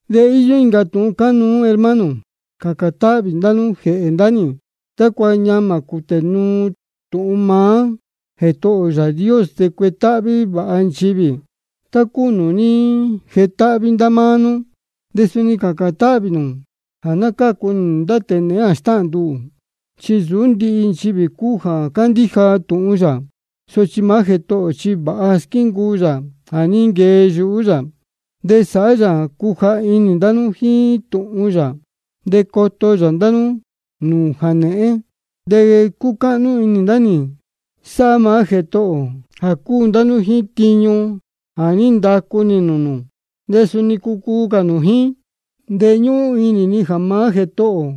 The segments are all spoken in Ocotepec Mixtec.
De íyó incā tūhun cánuú, hermano. Cācān táhvī ndá nú jēhē ndá nī, tácua ñamā cūtē nuu tūhun maá Jētohō ō Yāā Dios, de cuetáhví vāha nchivī, tá cúu nūū ní jetáhví ndá máá nú. De suni cācān táhvī nū jā ná cácu nī nūū ndá tēe nēhén jā stáhān ndá nduhū. Chi nsūú ndihi nchivī cúu jā cándíja tūhun yā. Sochi maá Jētohō ō chi vāha squíncuu yā jā ní nquee yuhú yā, de sāhá yā jā cuja inī ndá nú jíín tūhun yā, de coto yā ndá nú nūū jānēhén. De cúcáhnú inī ndá nī sáhá maá Jētohō ō, jā cúu ndá nú jíín tiñu jā ní ndacu nī nūū nū, de suni cucuu cā nū jíín. De ñúhún inī ni jā maá Jētohō ō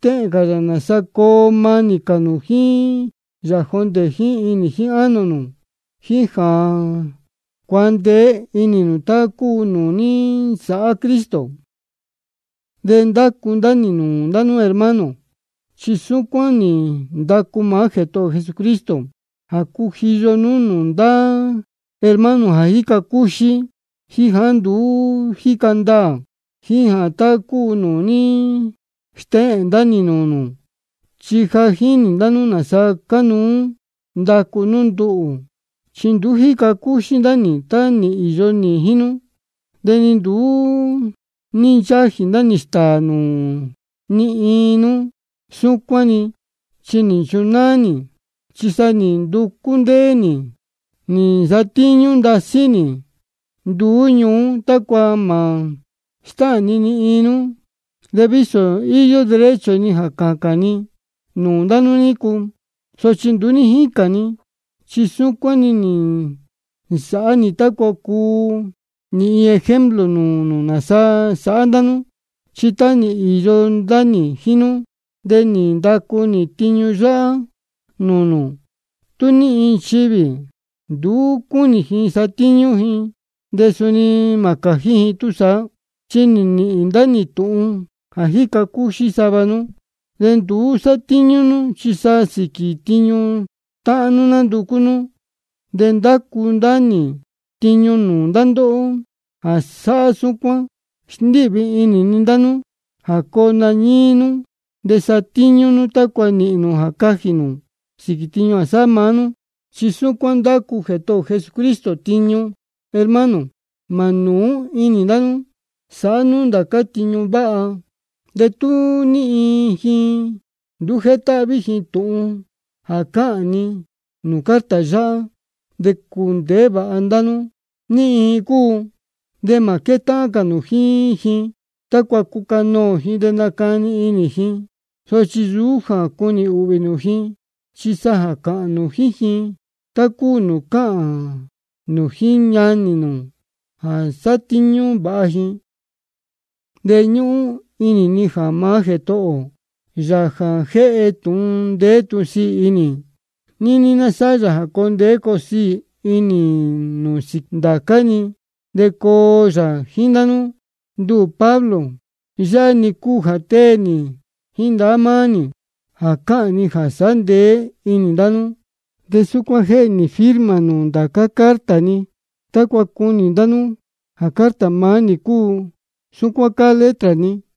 stéhēn cā yā nāsa coo manī cā nū jíín yā jondē jíín inī jíín ánō nū, jíín jā cuandeé inī nū tá cúu nūū ní nsāhá Cristo. De ndácu ndá nī nūū ndá nú hermano, chi súcuán nī ndacu maá Jētohō ō Jesucristo, jā cujiyo nú nūū ndá hermano jā jíca cúxí de nduú jíca ndaā ji tá cúu nūū ní stéhēn ndá nī nūū nū. Chi ja jínī ndá nú nāsa cánuú ndacu nú ndá nduhū, chi nduú ní jíca cúxí ndá nī tá nī īyo nī jíín nú. De ni nduú ní nchájī ndá nī stāā nūū ni iin nú súcuán-ni, chi nī nchunáá nī. Chi sa nī nducú ndéé nī nī nsatíñú ndasí nī nduú ñuú, tácua mā stáhān ni ni iin nú. De vísō íyó derecho ni jā cācān ni nūū ndá nú nícu, sochi nduú ní jícān ni, chi súcuán nī nsāhá nī tácua cuu nī iin ejemplo nūū nū nāsa sāhá ndá nú. Chi tá nī īyo ndá nī jíín nú, de nī ndacu nī tiñu yáhá nūū nū: Tú ní iin nchivī nduú cúnī ji satíñú ji, de suni mā cājí ji túsaá. Chi nī nīhīn ndá nī tūhun jā jíca cúxí sava nú, de nduú sátíñú nú, chi sa sīquī tiñu táhán nú nánducú nú. De ndácu ndá nī tiñu nūū ndá ndóhó jā sáhá súcuán, de sndíhvī inī ni ndá nú jā coo nañíí nú de satíñú nú, tácua nīhīn nū jā cajī nū sīquī tiñu jā sáhá maá nú. Chi súcuán ndácu maá Jētohō ō Jesucristo tiñu. Hermano, mā nūú inī ndá nú sāhá nú ndācá tiñu váha. De tú ní iin ji nduú jétáhví ji tūhun jā cáhān ni nūū carta yáhá, de cundēhé vāha nú ní iin ji cúu, de mā quétáhán cā nū jíín ji, tácua cucanoō ji de nacani inī ji. Sochi nsūú jā cunī ūhvī nū ji, chi sa cāhān nū jíín ji tá cúu nūū cáhān nū jíín ñanī nū jā ná sátíñú vāha ji. De ñúhún inī ni jā maá Jētohō ō, Yāā jā jéhe tūhun ndeé tūhun sīī inī, níní ná sáhá yā jā coo ndeé coo siī inī nū sīquī ndācá-ni, de coo yā jíín ndá nú. Nduhū Pablo, yáhá-ni cúu jā tée nī jíín ndahá maá nī jā cáhān ni jā sāhá ndeé inī ndá nú. De súcuán jéhe nī firma nūū ndācá carta ni, tácua cunī ndá nú jā carta maá nī cúu. Súcuán cáá letra ni.